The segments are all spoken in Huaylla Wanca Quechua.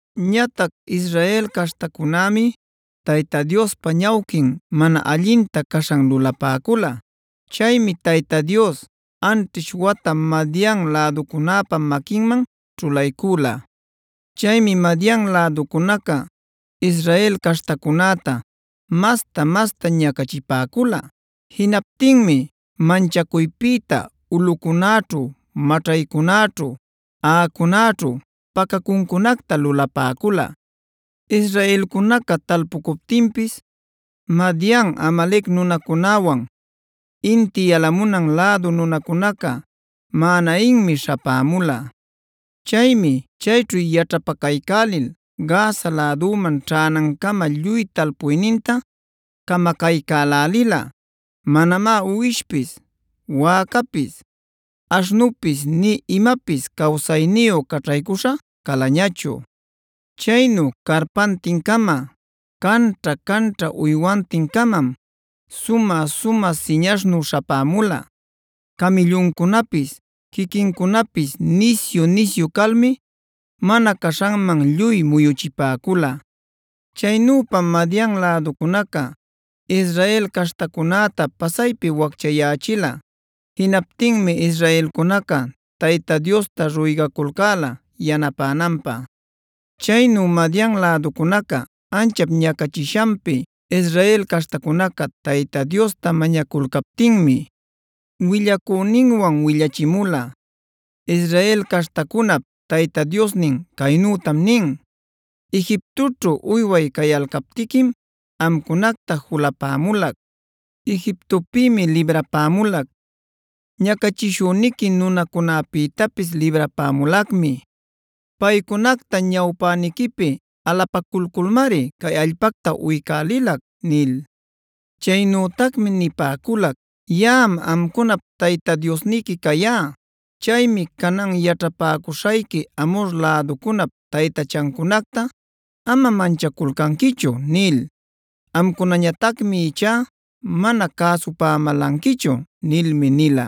Ñatac Israel caśhtacunämi Tayta Diospa ñawquin mana allinta caśhan lulapäcüla. Chaymi Tayta Dios anćhish wata Madian läducunäpä maquinman ćhulaycüla. Chaymi Madian läducunaca Israel caśhtacunäta masta-masta ñacachipäcula. Jinaptinmi manchacuypïta ulꞌucunäćhu maćhaycunäćhu, aꞌacunäćhu pacacuncunacta lulapäcula. Israelcunaca talpucuptinpis Madian, Amalec nunacunäwan, inti yalamunan lädu nunacunaca maꞌaninmi śhapämula. Chaymi chayćhu yaćhapacaycälil Gaza läduman ćhänancama lluy talpuyninta camacaycälälila. Manamá uwishpis, wäcapis, aśhnupis nï imapis cawsayniyu caćhaycuśha calañachu. Chaynu carpantin-cama canćha-canćha uywantin-camam sumä-sumä siñaśhnu śhapämula. Camïlluncunapis quiquincunapis nisyu-nisyu calmi mana caśhanman lluy muyuchipäcula. Chaynüpam Madian läducunaca Israel caśhtacunäta pasaypi wacchayächila. Jinaptinmi israelcunaca Tayta Diosta ruygaculcäla yanapänanpä. Chaynu Madian läducunaca anchap ñacachishanpi Israel caśhtacunaca Tayta Diosta mañaculcaptinmi, willacüninwan willachimula: “Israel caśhtacunap Tayta Diosnin caynütam nin: ‘Egiptoćhu uyway cayalcaptiquim amcunacta julapämulac. Egiptopïmi librapämulac; ñacachishüniqui nunacunapïtapis librapämulacmi. Paycunacta ñawpäniquipi alapaculculmari cay allpacta uycälilac’ nil. Chaynütacmi nipäculac: ‘Yaꞌam amcunap Tayta Diosniqui cayá. Chaymi canan yaćhapäcuśhayqui Amhor läducunap taytachancunacta ama manchaculcanquichu’ nil. Amcunañatacmi ichá mana cäsupämälanquichu” nilmi nila.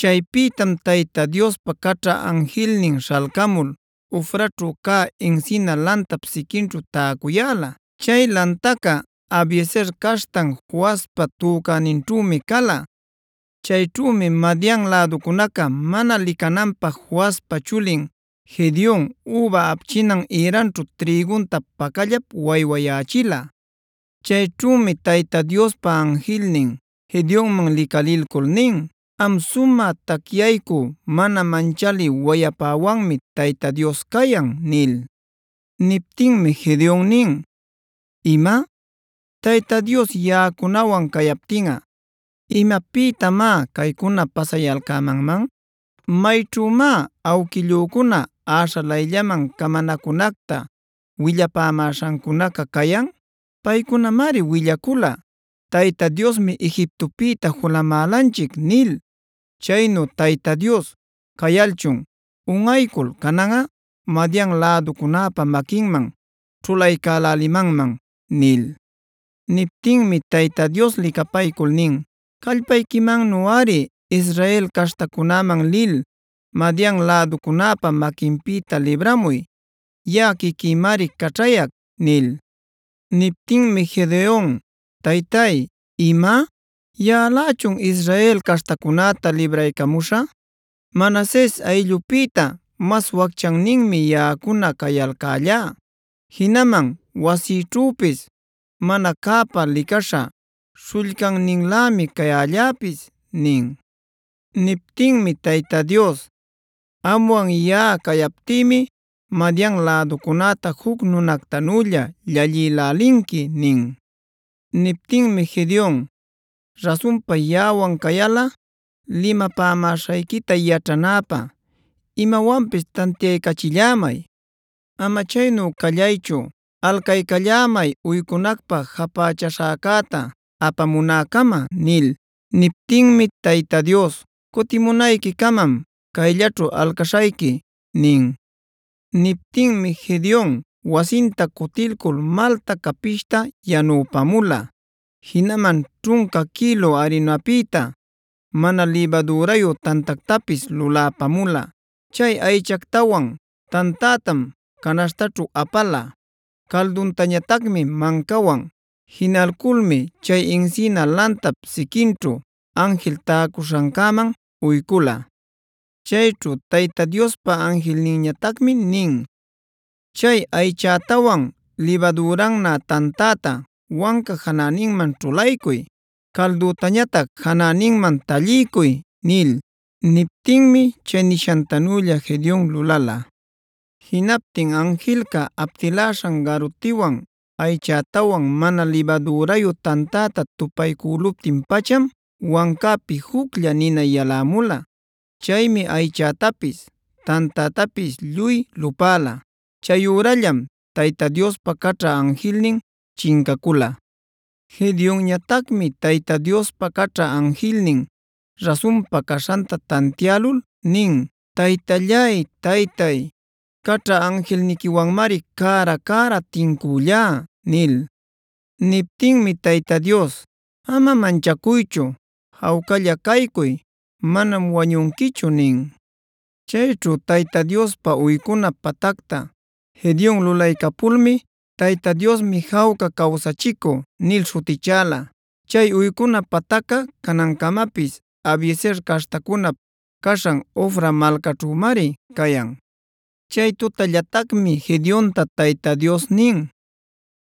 Chaypïtam Tayta Diospa caćha anjilnin śhalcamul Ofraćhu cä encina lantap siquinćhu täcuyäla. Chay lantaca Abiezer caśhtan Joaspa tucäninćhümi cala. Chayćhümi Madian läducunaca mana licananpä Joaspa chulin Gedeona üba apchinan ïranćhu trïgunta pacallap waywayächila. Chayćhümi Tayta Diospa anjilnin Gedeonman licalilcul nin: “Am sumä tacyaycü mana manchalï wayapäwanmi Tayta Dios cayan” nil. Niptinmi Gedeon nin: “¿¡Ima!? Tayta Dios yaꞌacunawan cayaptinꞌa, ¿imapïtamá caycuna pasayalcämanman? ¿Mayćhümá awquillücuna äśhalayllaman camanacunacta willapämäśhancunaca cayan? Paycunamari willacula ‘Tayta Diosmi Egiptopïta julamälanchic’ nil. Chaynu Tayta Dios cayalchun unꞌaycul cananꞌa Madian läducunäpä maquinman ćhulaycälälimanman” nil. Niptinmi Tayta Dios licapaycul nin: “Callpayquimannuꞌari Israel caśhtacunäman lil Madian läducunäpa maquinpïta libramuy. Yaꞌa quiquïmari caćhayac” nil. Niptinmi Gedeon: “Taytay, ¿¡ima!? ¿Yaꞌalächun Israel caśhtacunäta libraycamuśhä? Manases ayllupïta mas wacchanninmi yaꞌacuna cayalcällá. Jinaman wasïćhüpis mana cäpä licaśha śhullcanninlämi cayalläpis” nin. Niptinmi Tayta Dios: “Amwan yaꞌa cayaptïmi Madian läducunäta juc nunactanülla llallïlälinqui” nin. Niptinmi Gedeon: “Rasunpa yaꞌawan cayalꞌa limapämaśhayquita yaćhanäpä imawanpis tantiaycachillämay. Ama chaynu callaychu, alcaycallämay uycunacpä japächaśhäcäta apamunäcama” nil. Niptinmi Tayta Dios: “Cutimunayquicamam cayllaćhu alcaśhayqui” nin. Niptinmi Gedeon wasinta cutilcul malta capishta yanüpamula. Jinaman ćhunca quïlu arinapïta mana libadürayu tantactapis luläpamula. Chay aychactawan, tantätam canaśhtaćhu apala, calduntañatacmi mancawan. Jinalculmi chay encina lantap siquinćhu anjil täcuśhancäman uycula. Chayćhu Tayta Diospa anjilninñatacmi nin: “Chay aychätawan libadürannä tantäta wanca janäninman ćhulaycuy. Calduntañatac janäninman talliycuy” nil. Niptinmi chay nishantanülla Gedeon lulala. Jinaptin anjilca aptiläśhan garutinwan aychätawan mana libadürayu tantäta tupaycüluptin-pacham wancäpi juclla nina walämula. Chaymi aychätapis, tantätapis lluy lupäla. Chayürallam Tayta Diospa caćha anjilnin chincacula. Gedeonñatacmi Tayta Diospa caćha anjilnin rasunpa caśhanta tantiälul nin: “Taytallay-taytay, caćha anjilniquiwanmari cära-cära tincüllá” nil. Niptinmi Tayta Dios: “Ama manchacuychu. Jawcalla caycuy. Manam wañunquichu” nin. Chayćhu Tayta Diospä uycuna patacta Gedeon lulaycapulmi “Tayta Diosmi jawca cawsachicü” nil śhutichäla. Chay uycuna patacca canancamapis Abiezer caśhtacunap caśhan Ofra malcaćhümari cayan. Chay tutallatacmi Gedeonta Tayta Dios nin: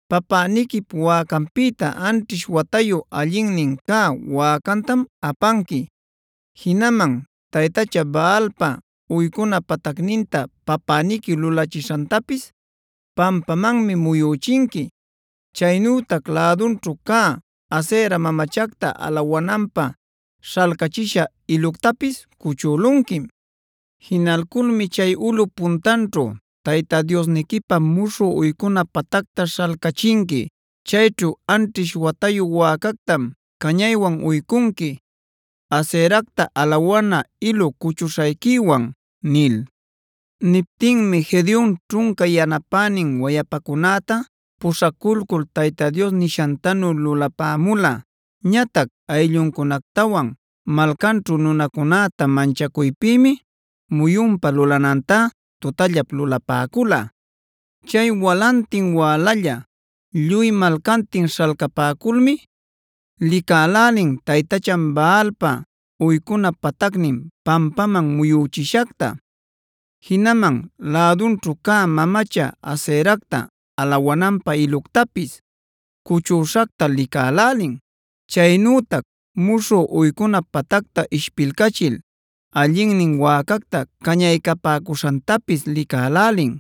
“Papäniquip wäcanpïta anćhish watayu allinnin cä wäcantam apanqui. Jinaman taytacha Baalpa uycuna patacninta papäniqui lulachishantapis pampamanmi muyüchinqui. Chaynütac lädunćhu cä Asera mamachacta alawananpä śhalcachisha iluctapis cuchülunquim. Jinalculmi chay ulꞌup puntanćhu Tayta Diosniquipä muśhü uycuna patacta śhalcachinqui. Chayćhu anćhish watayu wäcactam cañaywan uycunqui Aseracta alawana ilu cuchuśhayquiwan” nil. Niptinmi Gedeon ćhunca yanapänin wayapacunäta puśhaculcul Tayta Dios nishantanu lulapämula. Ñatac aylluncunactawan malcanćhu nunacunäta manchacuypïmi muyunpa lulanantá tutallap lulapäcula. Chay walantin wälalla lluy malcantin śhalcapäculmi licälälin taytachan Baalpa uycuna patacnin pampaman muyüchishacta; jinaman lädunćhu cä mamacha Aseracta alawananpä iluctapis cuchüśhacta licälälin. Chaynütac muśhü uycuna patacta ishpilcachil allinnin wäcacta cañaycapäcuśhantapis licälälin.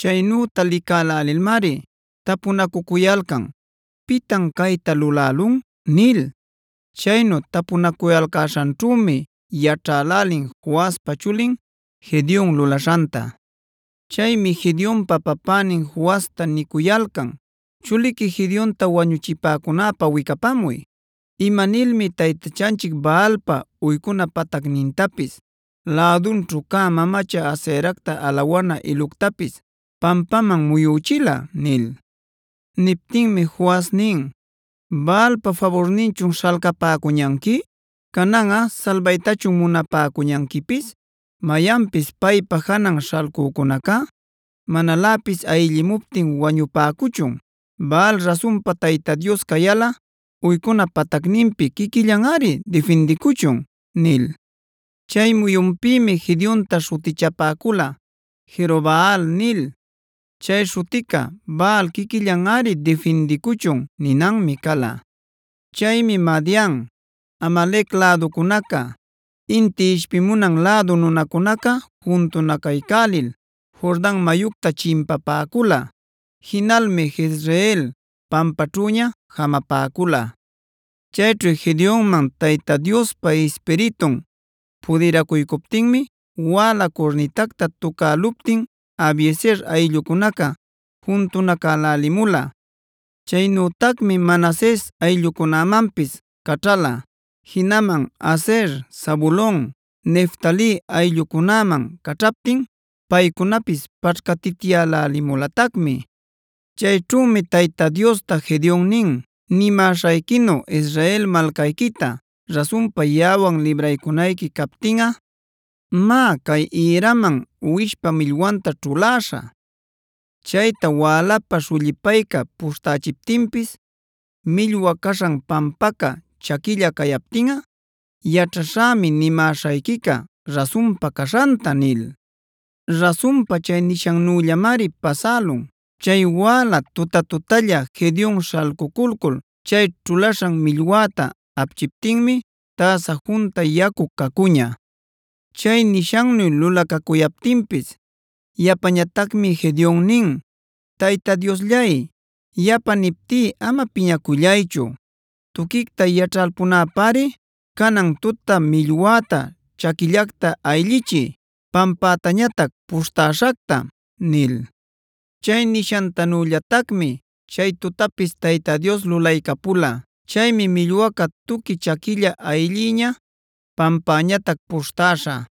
Chaynüta licälälilmari tapunacucuyalcan: “¿Pitan cayta lulälun?” nil. Chaynu tapunacuyalcäśhanćhümi yaćhälälin Joaspa chulin Gedeon lulaśhanta. Chaymi Gedeonpa papänin Joasta nicuyalcan: “Chuliqui Gedeonta wañuchipacunäpä wicapamuy. Ima nilmi taytachanchic Baalpa uycuna patacnintapis, lädunćhu cä mamacha Aseracta alawana iluctapis pampaman muyüchila” nil. Niptinmi Joas nin: “¿Baalpa faburninchun śhalcapäcuñanqui? ¿Cananꞌa salbaytachun munapäcuñanquipis? ¡Mayanpis paypa janan śhalcücunacá manaläpis ayllimuptin wañupäcuchun! Baal rasunpa Tayta Dios cayalꞌa uycuna patacninpi quiquillanꞌari difindicuchun” nil. Chay muyunpïmi Gedeonta śhutichapäcula “Jerobaal” nil. Chay śhutica “Baal quiquillanꞌari difindicuchun” ninanmi cala. Chaymi Madian, Amalec läducunaca, inti ishpimunan lädu nunacunaca juntunacaycälil Jordan mayucta chimpapäcula. Jinalmi Jezreel pampaćhüña jamapäcula. Chayćhu Gedeonman Tayta Diospa Ispiritun pudiracuycuptinmi wäla curnitacta tucäluptin Abiezer ayllucunaca juntunacälälimula. Chaynütacmi Manases ayllucunämanpis caćhala; jinaman Aser, Zabulon, Neftali ayllucunäman caćhaptin paycunapis paćhcatityälälimulatacmi. Chayćhümi Tayta Diosta Gedeon nin: “Nimäśhayquinu Israel malcayquita rasunpa yaꞌawan libraycunayqui captinꞌa, má cay ïraman uwishpa millwanta ćhuläśhä. Chayta wälapä śhullipayca puśhtächiptinpis, millwa caśhan pampaca chaquilla cayaptinꞌa yaćhaśhämi nimäśhayquica rasunpa caśhanta” nil. Rasunpa chay nishannüllamari pasälun. Chay wäla tutä-tutälla Gedeon śhalcuculcul chay ćhulaśhan millwäta apchiptinmib täsa junta yacu cacuña. Chay nishannu lulacacuyaptinpis yapañatacmi Gedeon nin: “Tayta Diosllay, yapa niptí ama piñacullaychu. Tuquicta yaćhalpunäpäri, canan tuta millwäta chaquillacta ayllichiy, pampätañatac puśhtäśhacta” nil. Chay nishantanüllatacmi chay tutapis Tayta Dios lulaycapula. Chaymi millwaca tuqui chaquilla ayllïña, pampäñatac puśhtäśha.